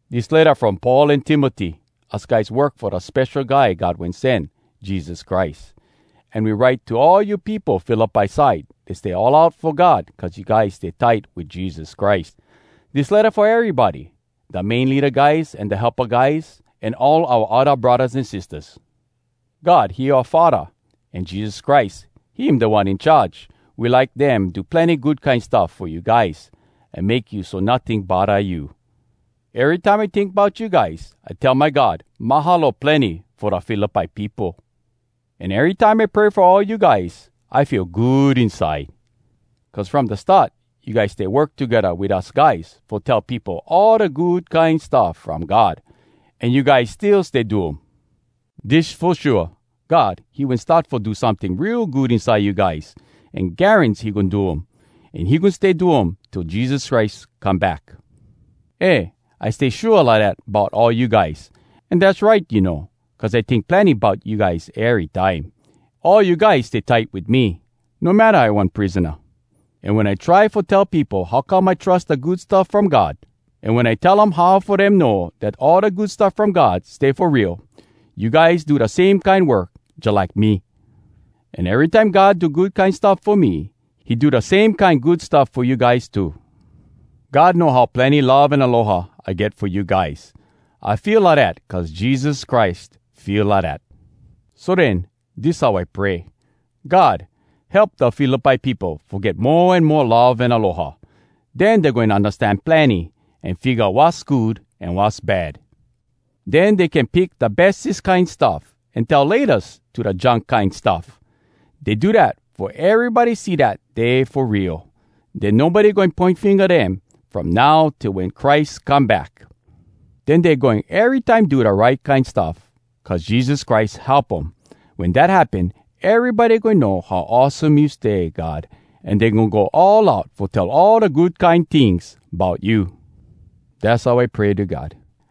Dis letta from Paul an Timoty. Us guys work fo da Spesho Guy God Wen Sen, Jesus Christ. An we write to all you peopo Philippi side dat stay all out fo God cuz you guys stay tight wit Jesus Christ. Dis letta fo erybody, da main leada guys an da helpa guys, an all oua odda braddahs an sistahs. God, he oua Faddah, an Jesus Christ, him Da One In Charge. We like dem do plenny good kine stuff fo you guys, an make you so notting bodda you. Erytime I tink bout you guys, I tell my God, “Mahalo plenny fo da Philippi peopo!” An erytime I pray fo all you guys, I feel good inside. Cuz from da start, you guys stay work togedda wit us guys fo tell peopo all da Good Kine Stuff From God, an you guys still stay do um. Dis fo shua: God, he wen start fo do someting real good inside you guys. An garans he goin do um! An he goin stay do um till Jesus Christ come back! Eh, I stay shua lidat bout all you guys. An dass right, you know, cuz I tink plenny bout you guys erytime. All you guys stay tight wit me, no matta I one prisona. An wen I try fo tell peopo how come I trus da Good Stuff From God, an wen I tell um how fo dem know dat all da Good Stuff From God stay fo real, you guys do da same kine work jalike me. An erytime God do good kine stuff fo me, he do da same kine good stuff fo you guys too. God know how plenny love an aloha I get fo you guys. I feel lidat cuz Jesus Christ feel lidat. So den, dis how I pray: “God, help da Philippi peopo fo get mo an mo love an aloha. Den dey goin undastan plenny, an figga wass good an wass bad. Den dey can pick da bestes kine stuff, an tell ‘Laytas’ to da junk kine stuff! Dey do dat fo erybody see dat dey fo real. Den nobody goin poin finga dem, from now till wen Christ come back! Den dey goin erytime do da right kine stuff, cuz Jesus Christ help um. Wen dat happen, erybody goin know how awesome you stay, God, an dey goin go all out fo tell all da good kine tings bout you!” Dass how I pray to God.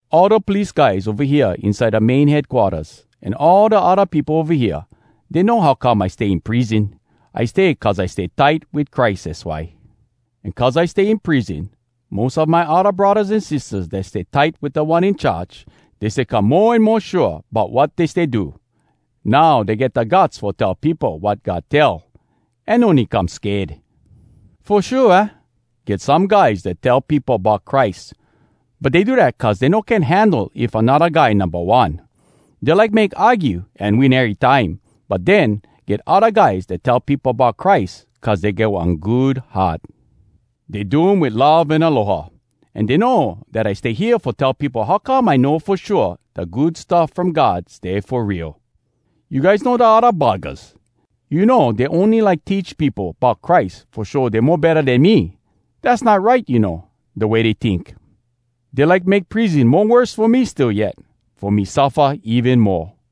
All da police guys ova hea inside da main headquarters, an all da odda peopo ova hea, dey know how come I stay in prison. I stay cuz I stay tight wit Christ, az why. An cuz I stay in prison, mos a my odda braddahs an sistahs dat stay tight wit Da One In Charge, dey stay come mo an mo shua bout wat dey stay do. Now dey get da guts fo tell peopo wat God tell, an no need come sked. Fo shua, aah? get some guys dat tell peopo bout Christ, but dey do dat cuz dey no can handle if anodda guy numba one. Dey like make argue an win erytime. But den, get odda guys dat tell peopo bout Christ cuz dey get one good heart. Dey do um wit love an aloha, an dey know dat I stay hea fo tell peopo how come I know fo shua da Good Stuff From God stay fo real. You guys know da odda buggahs! You know dey ony like teach peopo bout Christ fo show dey mo betta den me! Dass not right, you know, da way dey tink. Dey like make prison mo worse fo me still yet, fo me suffa even moa.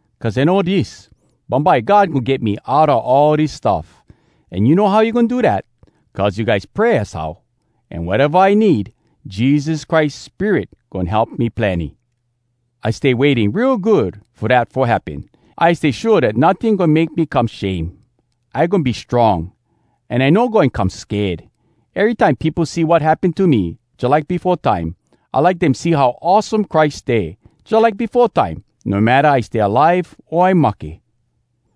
cuz I know dis: bumbye God goin get me outa all dis stuff. An you know how he goin do dat? Cuz you guys pray, az how. An wateva I need, Jesus Christ Spirit goin help me plenny. I stay waiting real good fo dat fo happen. I stay shua dat notting goin make me come shame. I goin be strong, an I no goin come sked. Erytime peopo see wat happen to me, jalike befo time, I like dem see how awesome Christ stay, jalike befo time, no matta I stay alive o I mahke.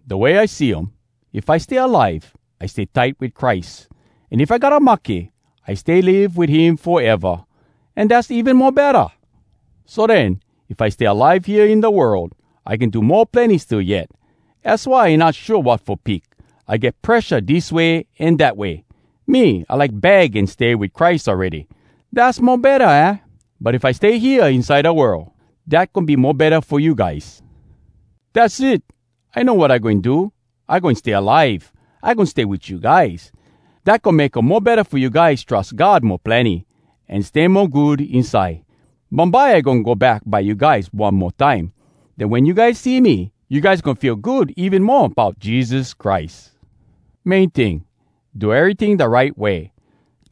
Da way I see um, if I stay alive, I stay tight wit Christ, an if I gotta mahke, I stay live wit him foeva, an dass even mo betta! So den, if I stay alive hea in da world, I can do mo plenny still yet. Az why I not shua wat fo pick. I get presha dis way an dat way! Me, I like bag an stay wit Christ awready! Dass mo betta, aah? But if I stay hea inside da world, dat goin be mo betta fo you guys. Dass it! I know wat I goin do. I goin stay alive. I goin stay wit you guys. Dat goin make um mo betta fo you guys trus God mo plenny, an stay mo good inside. Bumbye, I goin go back by you guys one mo time. Den wen you guys see me, you guys goin feel good even mo bout Jesus Christ! Main ting, do eryting da right way,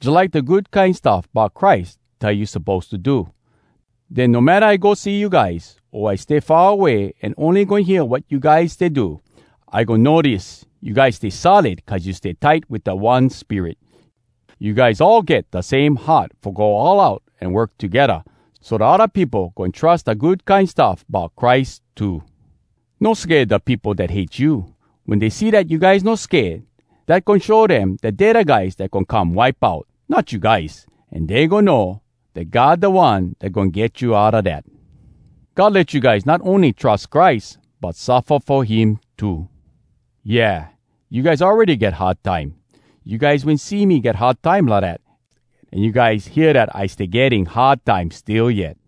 jalike da Good Kine Stuff Bout Christ tell you suppose to do. Den no matta I go see you guys, o I stay far away an ony goin hear wat you guys stay do, I goin know dis: you guys stay solid cuz you stay tight wit da one Spirit. You guys all get da same heart fo go all out an work togedda, so da odda peopo goin trus da Good Kine Stuff Bout Christ too. No sked da peopo dat hate you. Wen dey see dat you guys no sked, dat goin show dem dat dey da guys dat goin come wipe out, not you guys. An dey goin know dat God da One dat goin get you outa dat. God let you guys not ony trus Christ, but suffa fo him too. Yeah, you guys awready get hard time. You guys wen see me get hard time lidat, an you guys hear dat I stay getting hard time still yet.